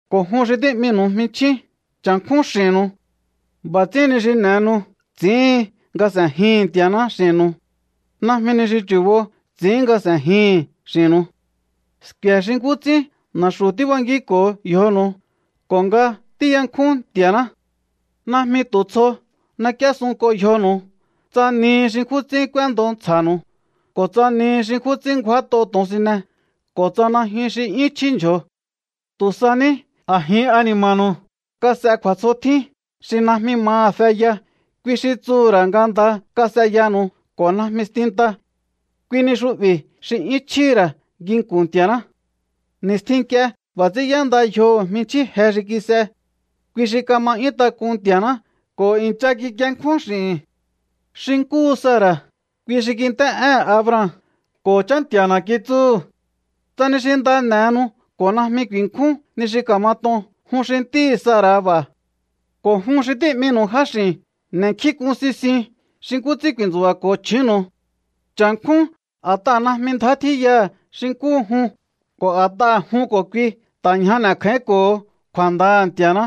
Ko̱ jun xi tí'minu̱u jminchjín, cha̱nkjún x'i̱nnu̱u. B'a̱ ts'ín ni xi n'e̱henu ts'i̱íhin nga s'e̱jihi̱n Nti̱a̱ná x'i̱nnu̱u. Najmi ni xi chu̱bo ts'i̱ín nga s'e̱jihi̱n x'i̱nnu̱u. Sku̱e̱ xi nkú ts'ín na̱xu̱ tíbankínko̱o yjonu̱u ko̱ nga tíyankjún Nti̱a̱ná. Najmi tu̱ tsjo n'ek'íésunk'o yjonu̱u, tsa nihi xi nkjún ts'ín k'úéndo ntsja̱nu̱u ko̱ tsa nihi xi nkjún ts'ín ngjúát'o to̱onsine ko̱ tsa najyun xi 'yún chjí ndyjo̱o. Tu̱ sa ní a̱jin ani̱ma̱nu̱u kas'e kju̱a̱tsjotjín xi najmi maha̱ feya, kui xi tsuhu̱ ra̱ nga nda kas'eyanu̱u ko̱ najmi stinta. Kui ni xu'bi̱ xi 'yún chjíhi̱ ra̱ nginku̱n Nti̱a̱ná. Ni̱stjin nk'ie b'a̱ ts'ín y'énda yjoho̱ jminchjín je xi kis'e. Kui xi kama 'yún tak'un Nti̱a̱ná ko̱ i̱ncha kikienkjún x'i̱hi̱n. Xi nkúhu Sara̱, kui xi kint'é'éhe̱n Abraham ko̱ “Chá Nti̱a̱na̱” kitsúhu̱. Tsa ni xi nda n'e̱henu ko̱ najmi ku̱i̱nkjún ni xi ka̱mat'on, jun xi ntíhi̱ Sara̱ b'a̱. Ko̱ jun xi tí'minu̱u jáx'i̱n, n'e̱nkjínk'un sisiun xi nkú ts'ín ku̱i̱ntsu̱ba̱ko̱o chju̱únnu̱u. Cha̱nkjún a̱t'aha̱ najmi ndjá tjíyaha̱ xi nkúhu jun, ko̱ a̱t'aha̱ jun ko̱ kui ta̱ ñja n'e̱kjáínko̱ho̱o kju̱a̱ndaha̱ Nti̱a̱ná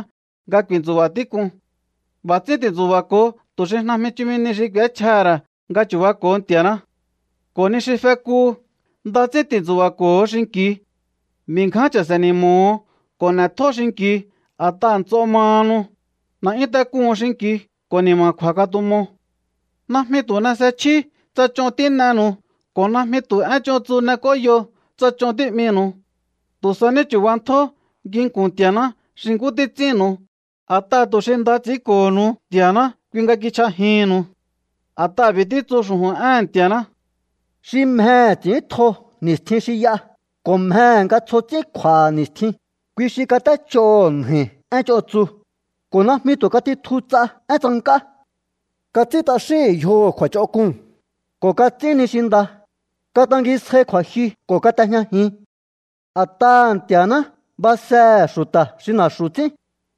nga ku̱i̱ntsu̱ba̱ tík'un. B'a̱ ts'ín ti̱ntsu̱ba̱ko̱o tu̱ xi najmi chumi nihi xi k'u̱échjaha̱ ra̱ nga chu̱bako̱o Nti̱a̱ná. Ko̱ ni xi fekuhu, nda ts'ín ti̱ntsu̱ba̱ko̱o xinki̱u. B'i̱ ngján cha̱se̱ ni̱mo̱ho̱o ko̱ n'e̱tjó xinki̱u a̱t'aha̱ nts'o mahanu. N'e̱'yún tak'un xinki̱u ko̱ ni̱ma̱kju̱a̱ katumo. Najmi tu̱ n'es'echjíú tsa ch'on tín'enu̱u ko̱ najmi tu̱ én ch'on tsu n'ek'óyo tsa ch'on tí'minu̱u. Tu̱ sa ní chu̱bantjó nginku̱n Nti̱a̱ná xi nkú títs'ínnu̱u, a̱t'aha̱ tu̱ xi nda ts'i̱ínko̱honu Nti̱a̱ná, kui nga kichj'ajihi̱nnu̱u. A̱t'aha̱ b'i̱ títsu xu̱ju̱n éhe̱n Nti̱a̱ná: Xi mjehe̱ ts'i̱íntjo ni̱stjin xi y'a, ko̱ mjehe̱ nga tsjo ts'ín kj'u̱a̱ha̱ ni̱stjin, kui xi kat'éch'oho̱ nja̱i̱ én ch'on tsu, ko̱ najmi tu̱ katitju ts'a én tsank'á. Kats'ín t'axíhi̱n yjoho̱ kju̱a̱ch'onk'uu̱n, ko̱ kats'ín ni xi nda. Katangisjai kju̱a̱jyu ko̱ kat'ejñajin. A̱t'aha̱ Nti̱a̱ná basehe̱ xu̱ta̱ xi na̱xu̱ ts'ín,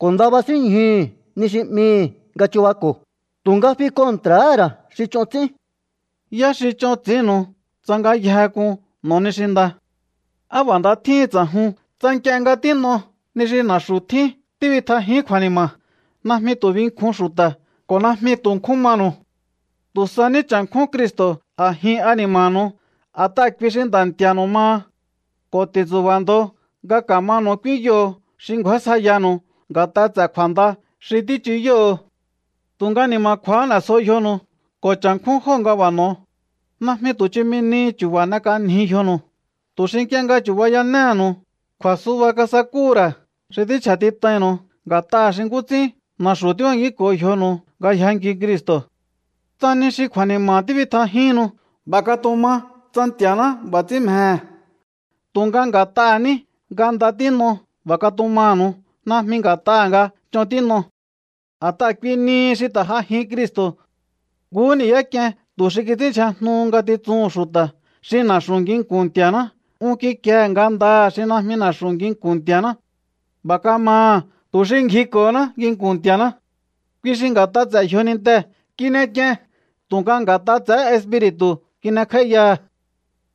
ko̱ nda basínñjuhu̱ ni xi 'mihi̱ nga chubako̱, tu̱nga fi kontra̱há ra̱ xi ch'on ts'ín. ¿Yá xi ch'on ts'i̱ínnu̱u tsa ngayjehe k'un n'o̱o ni xi nda? ¡Á b'a̱ nda tjíhin ts'a̱jun tsa nk'ie nga tín'o ni xi na̱xu̱ tjín tíbitjajíún kju̱a̱ni̱ma̱! Najmi tu̱ binkjun xu̱ta̱ ko̱ najmi tu̱ nkjún manu̱u. Tu̱ sa ní cha̱nkjún Cristo̱ a̱jin ani̱ma̱nu̱u, a̱t'aha̱ kui xi Nda̱ Nti̱a̱nu̱u maha. Ko̱ ti̱ntsu̱ba̱ ndo nga ka̱manu̱u k'úínyoho̱o xi ngju̱ásjaiyanu̱u nga̱t'a ts'e̱ kju̱a̱nda xi tíchuyóho̱o. Tu̱nga ni̱ma̱kju̱a̱há n'e̱sjo yjonu̱u ko̱ cha̱nkjún jóo̱ nga b'a̱ n'o̱o. Najmi tu̱ chumi ni chu̱ba̱ n'ek'anjiu yjonu̱u, tu̱ xi nk'ie nga chu̱bayanéhe̱nu̱u kju̱a̱suba kasakúhu̱ ra̱ xi tínchja̱tit'ainnu̱u nga̱t'aha̱ xi nkú ts'ín na̱xu̱ tíbankínko̱o yjonu̱u nga yjankiu Cristo̱. Tsa ni xi kju̱a̱ni̱ma̱ tíbitjajíhinnu, b'a̱ katuma tsa Nti̱a̱ná b'a̱ ts'ín mjehe̱. Tu̱nga nga̱t'aha̱ ní nga nda tín'o b'a̱ katumanu̱u, najmi nga̱t'aha̱ nga ch'on tín'o. A̱t'aha̱ kui nihi xi ta̱ j'ajin Cristo̱. Nkuhú ni̱yá k'ien tu̱ xi kits'ínndyjajnuhu ngatitsuhu̱n xu̱ta̱. Xi na̱xu̱ nginku̱n Nti̱a̱ná un kikiehe̱ ngandaha̱ xi najmi na̱xu̱ nginku̱n Nti̱a̱ná. B'a̱ kamaha̱ tu̱ xi ngjiko̱honá nginku̱n Nti̱a̱ná. Kui xi nga̱t'a ts'e̱ yjonintehe̱ kin'ek'ien tu̱nga nga̱t'a ts'e̱hé espiri̱tu̱hu̱ kin'ekj'áíyaha̱.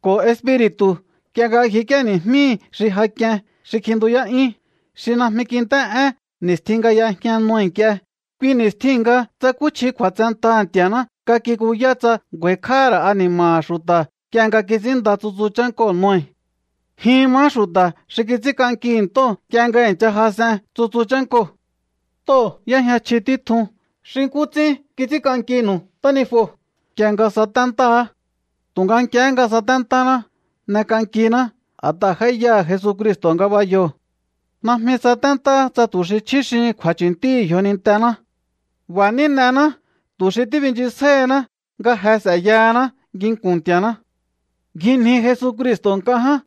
Ko̱ espiri̱tu̱ nk'ie nga ngjik'íéni̱jmíhi̱ xi ja k'ien xi kjintuyá'yún, xi najmi kint'é'én ni̱stjin nga y'ejña Noe nk'ie, kui ni̱stjiu̱n nga tsakúchji kju̱a̱tsentaha̱ Nti̱a̱ná nga kikuyá tsa ngju̱a̱i̱kj'áha̱ ra̱ ani̱ma̱ha̱ xu̱ta̱ nk'ie nga títs'ínnda tsutsu chánkoo̱ Noe. Jin mahá xu̱ta̱ xi kits'ínk'ankihi̱ ntóo̱ nk'ie nga i̱ncha jas'en tsutsu chánkoo̱. Ntóo̱ y'éjña chji títjun xi nkú ts'ín kits'ínk'ankinu̱u ntánijuo̱ nk'ie nga saténtáá. Tu̱nga nk'ie nga saténtáná, n'ek'ankiná a̱t'aha̱ j'áíyaha̱ Jesucristo̱ ngabayoo̱. Najmi saténtáá tsa tu̱ xi chjuxíhin kju̱a̱chu̱ntíhi̱ yjonintená. B'a̱ ní n'ená tu̱ xi tíbinchisjáíhiná nga je s'e̱yahaná nginku̱n Nti̱a̱ná. Ngjinji Jesucristo̱ nk'a ján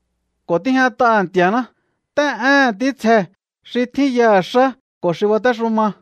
ko̱ tíjñat'aha̱ Nti̱a̱ná. Nt'é'éhe̱n ntítsjee̱, xi tjín yaha̱ xá ko̱ xi batéxuma.